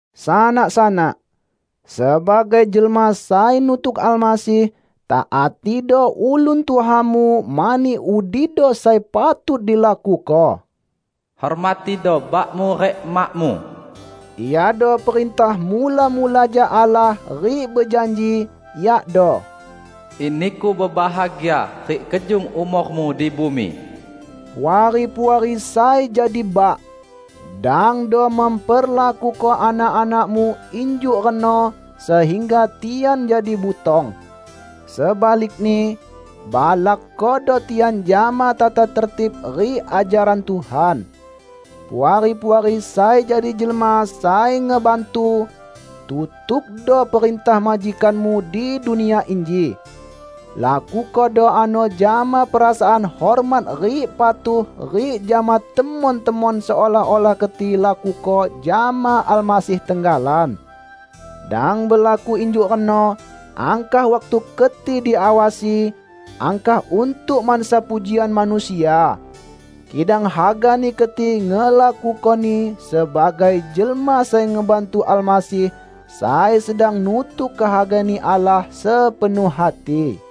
Sanak-sanak! Sebagai jelma sai nutuk Almasih, taatido ulun tuhamu mani udido sai patut dilakuko. "Hormatido bakmu rik emakmu" iado perintah mula-mula jak Allah rik bejanji, yakdo: "In niku bebahagia rik kejung umormu di bumi". Puari-puari sai jadi bak! Dangdo memperlakuko anak-anakmu injuk reno sehingga tian jadi butong. Sebalikni, balakkodo tian jama tata tertib rik ajaran Tuhan. Puari-puari sai jadi jelma sai ngebantu! Tutukdo perintah majikanmu di dunia inji. Lakukodo ano jama perasaan hormat rik patuh rik jama temon-temon seolah-olah keti lakuko jama Almasih tenggalan. Dang belaku injuk reno angkah waktu keti diawasi, angkah untuk mansa pujian manusia. Kidang hagani keti ngelakukoni sebagai jelma sai ngebantu Almasih sai sedang nutuk kehaga-Ni Allah sepenuh hati.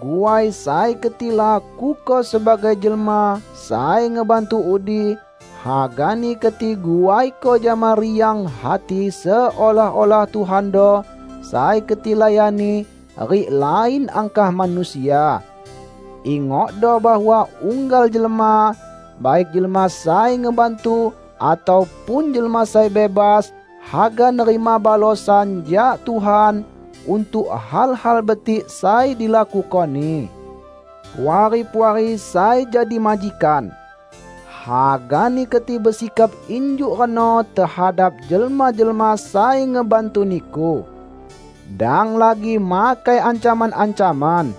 Guai sai keti lakuko sebagai jelma sai ngebantu udi, hagani keti guaiko jama riang hati seolah-olah Tuhando sai keti layani, rik lain angkah manusia. Ingokdo bahwa unggal jelma, baik jelma sai ngebantu atau pun jelma sai bebas, haga nerima balosan jak Tuhan untuk hal-hal betik sai dilakukoni. Puari-puari sai jadi majikan! Hagani keti besikap injuk reno tehadap jelma-jelma sai ngebantu niku. Dang lagi makai ancaman-ancaman.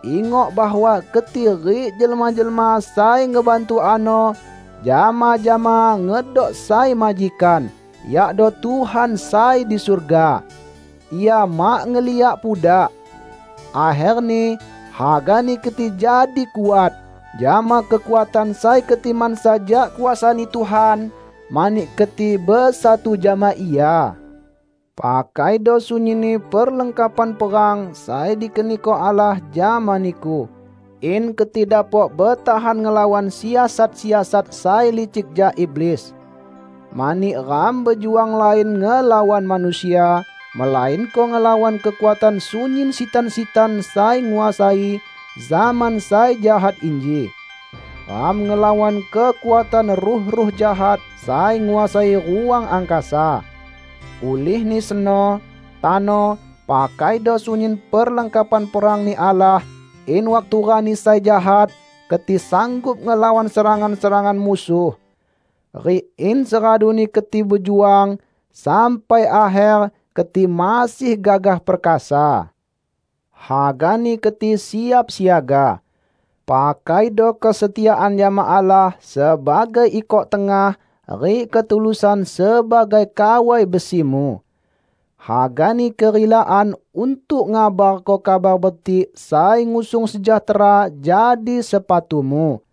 Ingok bahwa keti rik jelma-jelma sai ngebantu ano, jama-jama ngedok sai majikan, yakdo Tuhan sai di surga. Ia mak ngeliak pudak. Akherni, hagani keti jadi kuat, jama kekuatan sai keti mansa jak kuasa-Ni Tuhan, mani keti besatu jama Ia. Pakaido sunyinni perlengkapan perang sai dikeniko Allah jama niku, in keti dapok betahan ngelawan siasat-siasat sai licik jak iblis. Mani ram bejuang lain ngelawan manusia, melainko ngelawan kekuatan sunyin sitan-sitan sai nguasai zaman sai jahat inji. Ram ngelawan kekuatan ruh-ruh jahat sai nguasai ruang angkasa. Ulihni seno, tano, pakaido sunyin perlengkapan perang-Ni Allah, in waktu rani sai jahat keti sanggup ngelawan serangan-serangan musuh. Rik in seraduni keti bejuang sampai akher, keti masih gagah perkasa. Hagani keti siap siaga. Pakaido kesetiaan jama Allah sebagai ikok tengah, rik ketulusan sebagai kawai besimu. Hagani kerilaan untuk ngabarko Kabar Betik sai ngusung sejahtera jadi sepatumu.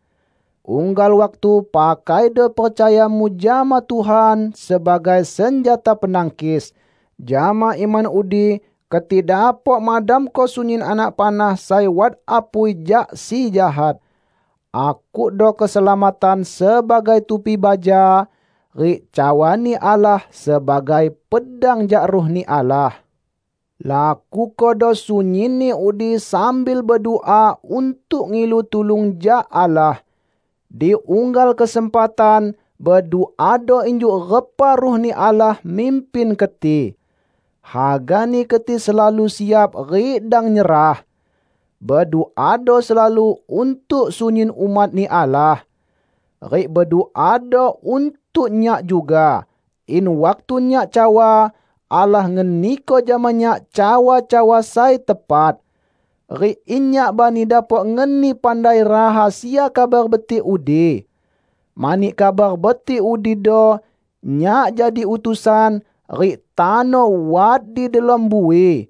Unggal waktu pakaido percayamu jama Tuhan sebagai senjata penangkis; jama iman udi keti dapok madamko sunyin anak panah sai wat apui jak si jahat. Akukdo keselamatan sebagai tupi baja, rik cawa-Ni Allah sebagai pedang jak Ruh-Ni Allah. Lakukodo sunyinni udi sambil bedua untuk ngilu tulung jak Allah. Di unggal kesempatan, beduado injuk repa Ruh-Ni Allah mimpin keti. Hagani keti selalu siap rik dang nyerah. Beduado selalu untuk sunyin umat-Ni Allah. Rik beduado untuk nyak juga, in waktu nyak cawa, Allah ngeniko jama nyak cawa-cawa sai tepat. Rik in nyak bani dapok ngeni pandai rahasia Kabar Betik udi. Mani Kabar Betik udido, nyak jadi utusan, rik tano wat di delom bui.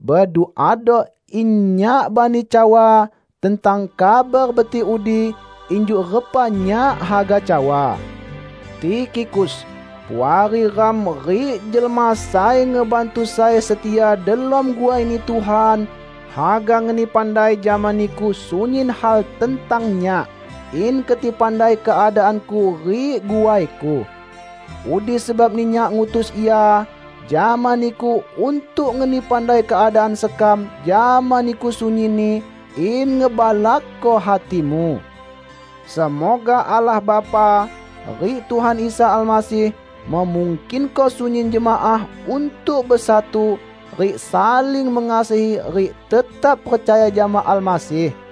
Beduado in nyak bani cawa tentang Kabar Betik udi, injuk repa nyak haga cawa. Tikhikus, puari ram rik jelma sai ngebantu sai setia delom guai-Ni Tuhan, haga ngeni pandai jama niku sunyin hal tentang nyak, in keti pandai keadaanku rik guaiku. Udi sebabni nyak ngutus ia jama niku untuk ngeni pandai keadaan sekam jama niku sunyinni, in ngebalakko hatimu. Semoga Allah Bapa, rik Tuhan Isa Almasih memungkinko sunyin jemaah untuk besatu rik saling mengasihi rik tetap percaya jama Almasih.